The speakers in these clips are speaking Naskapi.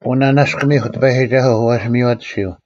ᐅ ᓂᓇᔅᑯᒥᐧᒄ ᑎᐸᔨᒋᒐᓱᐤ: ᐛᔅ ᒥᔽᑎᓯᐤ: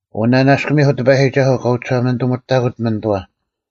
ᐅ ᓂᓇᔅᑯᒥᐧᒄ ᑎᐸᔨᒋᒐᓱᐤ ᑲ ᐅᒋᓴᒪᓂᑐᒥᑕᑯᑦ ᒥᓂᑐᐛ: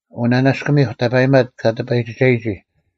ᐅ ᓂᓇᔅᑯᒥᐧᒄ ᑕᐸᔨᒪᑦ ᑲ ᑎᐸᔨᒋᒐᔨᒋ: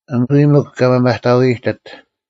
ᐊᓐ ᐎᔾ ᒥᒄ ᑲ ᒪᒪᑕᐤ ᐃᔨᑎᑦ: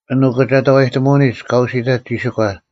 ᐊᓐ ᐅᑭᒐᑕᐛᔨᑎᒧᐅᓂᒡ ᑲ ᐅᓯᑕᑦ ᒋᓯᒂ: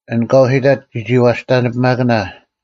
ᐊᓐ ᑲ ᐅᓯᑕᑦ ᒋᒋᐛᔅᑕᓂᐱᒪᑭᓇ: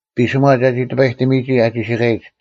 ᐱᓯᒺ ᒐᒋ ᑎᐸᔨᑎᒥᔨᒋ ᐊ ᒋᓯᑲᔨᒡ: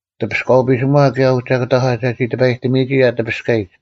ᑎᐱᔅᑲᐤ ᐱᓯᒺ ᑭᔭ ᐅᒐᑭᑕᒂ ᒐᒋ ᑎᐸᔨᑎᒥᔨᒋ ᐊ ᑎᐱᔅᑲᔨᒡ: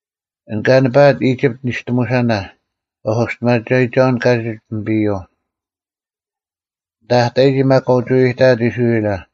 ᐊᓐ ᑲ ᓂᐸᐊᑦ ᐃᒋᑉᑦ ᓂᔅᑎᒧᓴᓇ: ᐛᔅ ᐅᒋᔅᑎᒪᒐᔨᒋᒐᐅᓐ ᑲᒋᒡ ᐱᒥᐱᔪᐤ; ᐊᓐᑕ ᐊ ᑕᔨᒋ ᒪᒃ ᑲ ᐅᒋ ᐎᐎᑕᐊᑦ ᐃᔅᕋᐃᓚ: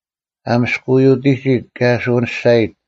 ᐊ ᒥᔅᑯᐎᐅᑎᒋᑦ, ᑭᔭ ᐊ ᓱᐅᓂᔅᒐᔨᑦ: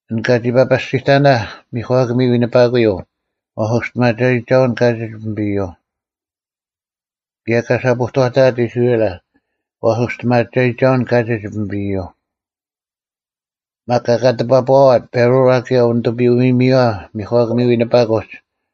ᐊᓐ ᑲᒋ ᐸᐸᔅᒋᑎᓇᐧᒃ ᒥᒂᑭᒥ ᐎᓂᐸᑯᔪᐤ: ᐛᔅ ᐅᒋᔅᑎᒪᒐᔨᒋᒐᐅᓐ ᑲᒋᒡ ᐱᒥᐱᔪᐤ; ᑭᔭ ᑲ ᓴᐳᐛᑕᐊᑦ ᐃᔅᕋᐃᓚ: ᐛᔅ ᐅᒋᔅᑎᒪᒐᔨᒋᒐᐅᓐ ᑲᒋᒡ ᐱᒥᐱᔪᐤ: ᒪᒃ ᑲ ᒂᑎᐱᐛᐸᐛᑦ ᐸᕈᐛ ᑭᔭ ᐅᓂᑐᐱᔪᐅ-ᐃᔨᒥᔪᐛ ᒥᒂᑭᒥ ᐎᓂᐸᑯᒡ: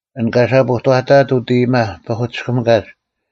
ᐊᓐ ᑲ ᓴᐳᐛᑕᐊᑦ ᐅᑦ ᐃᔨᒪ ᐸᐧᑯᑎᔅᑭᒥᑲᒡ: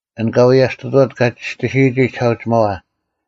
ᐊᓐ ᑲ ᐎᔭᔅᑐᑐᐛᑦ ᑲ ᒋᔅᑎᓯᔨᒋ ᒋᓴᐅᒋᒪᐛ: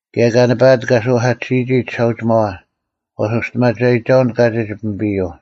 ᑭᔭ ᑲ ᓂᐸᐊᑦ ᑲ ᓱᐧᑲᑎᓯᔨᒋ ᒋᓴᐅᒋᒪᐛ: ᐛᔅ ᐅᒋᔅᑎᒪᒐᔨᒋᒐᐅᓐ ᑲᒋᒡ ᐱᒥᐱᔪᐤ: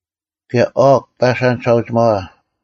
ᑭᔭ ᐅᒃ ᐸᓴᓐ ᒋᓴᐅᒋᒪᐛ: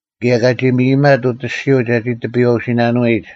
ᑭᔭ ᑲᒋ ᒥᔨᒥᒪᑦ ᐅᑦ ᐊᔅᒋᔪᐤ ᒐᒋ ᑎᐱᔨᐛᐅᓯᓇᓂᐎᔨᒡ: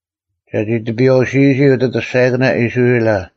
ᒐᒋ ᑎᐱᔨᐛᐅᓯᔨᒋ ᐅᑦ ᐊᑐᔅᒐᔭᑭᓇ ᐃᔅᕋᐃᓚ: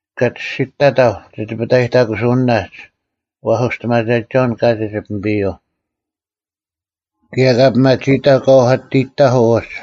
ᑲ ᒋᔅᒋᑐᑕᑕᐧᒄ ᒋ ᑎᐱᑕᔨᑕᑯᓯᐅᓂᓇᒡ: ᐛᔅ ᐅᒋᔅᑎᒪᒐᔨᒋᒐᐅᓐ ᑲᒋᒡ ᐱᒥᐱᔪᐤ; ᑭᔭ ᑲ ᐱᒪᒋᐃᑕᐧᒄ ᑲ ᐅᐧᑲᑎᔨᑕᐧᑯᐤ ᐅᒡ: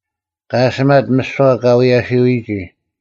ᑲ ᐊᓯᒪᑦ ᒥᓯᐛ ᑲ ᐎᔭᓯᔨᒋ: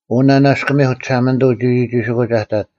ᐅ ᓂᓇᔅᑯᒥᐧᒄ ᒋᓴᒪᓂᑐᐤ ᒋᒋᒋᓯᑯᒡ ᐊ ᑕᑦ: